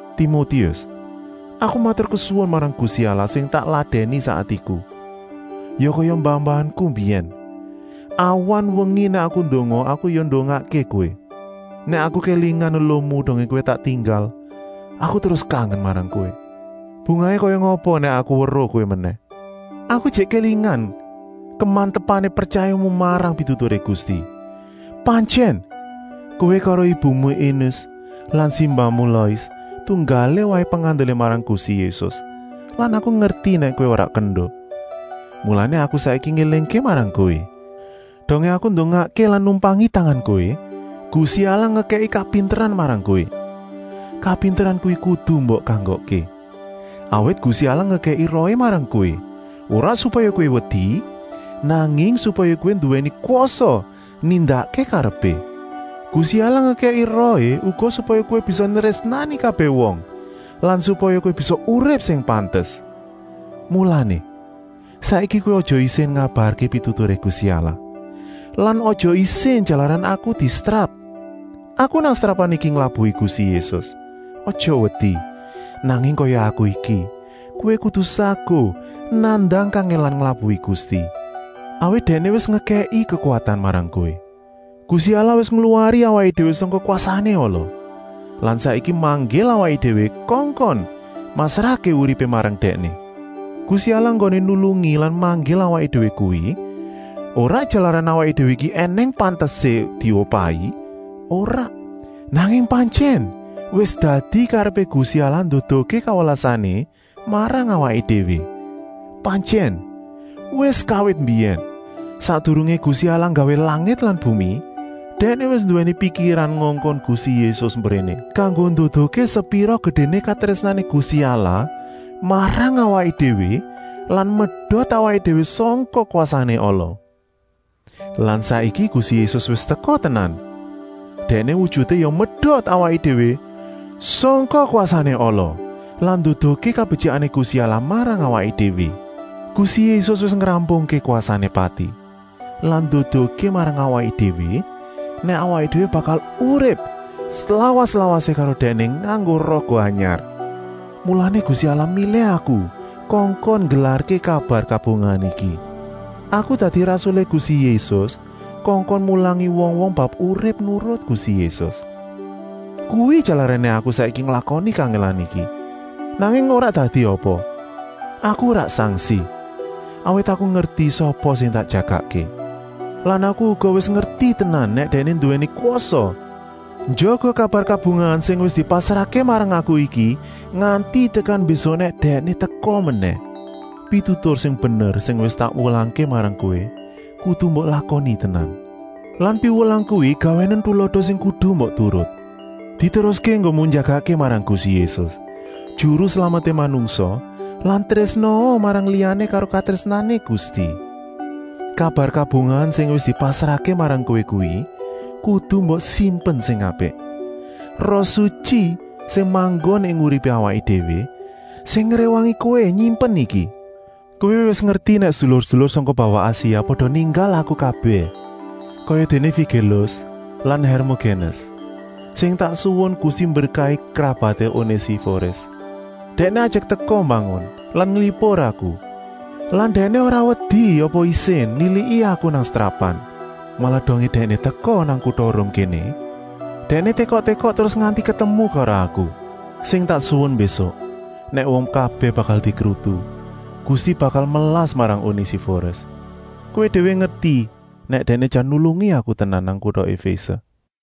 Timotius, aku maturkesuwun marang Gusti Allah sing tak ladèni sak atiku, ya kaya mbah-mbahanku mbiyèn. Awan-wengi nèk aku ndonga, aku ya ndongakké kowé. Nèk aku kélingan eluhmu dongé kowé tak tinggal, aku terus kangen marang kowé. Bungahé kaya ngapa nèk aku weruh kowé menèh. Aku ijik kélingan kemantepané pretyayamu marang pituturé Gusti. Pantyèn, kowé karo ibumu Enis lan simbahmu Lois tunggalé waé pengandelé marang Gusti Yésus lan aku ngerti nèk kowé ora kendo. Mulané aku saiki ngélingké marang kowé. Dongé aku ndongakké lan numpangi tangan kowé, Gusti Allah ngekèki kapinteran marang kowé, kapinteran kuwi kudu mbok kanggokké. Awit Gusti Allah ngekèki Rohé marang kowé, ora supaya kowé wedi, nanging supaya kowé nduwèni kwasa nindakké karepé. Gusti Allah ngekèki Rohé uga supaya kowé bisa nrésnani kabèh wong lan supaya kowé bisa urip sing pantes. Mulané, saiki kowé aja isin ngabarké pituturé Gusti Allah. Lan aja isin jalaran aku disetrap. Aku nang setrapan iki nglabuhi Gusti Yésus. Aja wedi, nanging kaya aku iki, kowé kudu saguh nandang kangèlan nglabuhi Gusti, awit Dèkné wis ngekèki kekuwatan marang kowé. Gusti Allah wis ngluwari awaké déwé sangka kwasané ala lan saiki manggil awaké déwé kongkon masrahké uripé marang Dèkné. Gusti Allah enggoné nulungi lan manggil awaké déwé kuwi ora jalaran awaké déwé iki ènèng pantesé diupahi, ora! Nanging pantyèn wis dadi karepé Gusti Allah nduduhké kawelasané marang awaké déwé. Pantyèn, wis kawit mbiyèn, sakdurungé Gusti Allah nggawé langit lan bumi, Dèkné wis nduwèni pikiran ngongkon Gusti Yésus mbréné, kanggo nduduhké sepira gedéné katrésnané Gusti Allah marang awaké déwé lan medot awaké déwé sangka kwasané ala. Lan saiki Gusti Yésus wis teka tenan, Dèkné wujuté ya medot awaké déwé sangka kwasané ala lan nduduhké kabetyikané Gusti Allah marang awaké déwé. Gusti Yésus wis ngrampungké kwasané pati lan nduduhké marang awaké déwé nèk awaké déwé bakal urip slawas-lawasé karo Dèkné nganggo raga anyar. Mulané Gusti Allah milih aku kongkon nggelarké kabar kabungahan iki. Aku dadi rasulé Gusti Yésus kongkon mulangi wong-wong bab urip nurut Gusti Yésus. Kuwi jalarané aku saiki nglakoni kangèlan iki. Nanging ora dadi apa, aku ora sangsi, awit aku ngerti sapa sing tak jagakké. Lan aku uga wis ngerti tenan nèk Dèkné nduwèni kwasa njaga kabar kabungahan sing wis dipasrahké marang aku iki nganti tekan mbésuk nèk Dèkné teka menèh. Pitutur sing bener sing wis tak wulangké marang kowé kudu mbok lakoni tenan lan piwulang kuwi gawénen tulada sing kudu mbok turut. Diteruské enggonmu njagakké marang Gusti Yésus, Juru Slameté manungsa lan trésnaa marang liyané karo katrésnané Gusti. Kabar kabungahan sing wis dipasrahké marang kowé kuwi kudu mbok simpen sing apik. Roh Sutyi, sing manggon ing uripé awaké déwé, sing ngréwangi kowé nyimpen iki. Kowé wis ngerti nèk sedulur-sedulur sangka bawah Asia pada ninggal aku kabèh, kayadéné Figélus lan Hèrmogénes. Sing tak suwun Gusti mberkahi krabaté Onésiforis. Dèkné ajek teka mbangun lan nglipur aku lan dèkné ora wedi apa isin niliki aku nang setrapan. Malah dongé dèkné teka nang kuta Rum kéné, dèkné tékok-tékok terus nganti ketemu karo aku. Sing tak suwun mbésuk, nèk wong kabèh bakal dikrutu, Gusti bakal melas marang Onésiforis. Kowé déwé ngerti nèk dèkné jan nulungi aku tenan nang kuta Efése.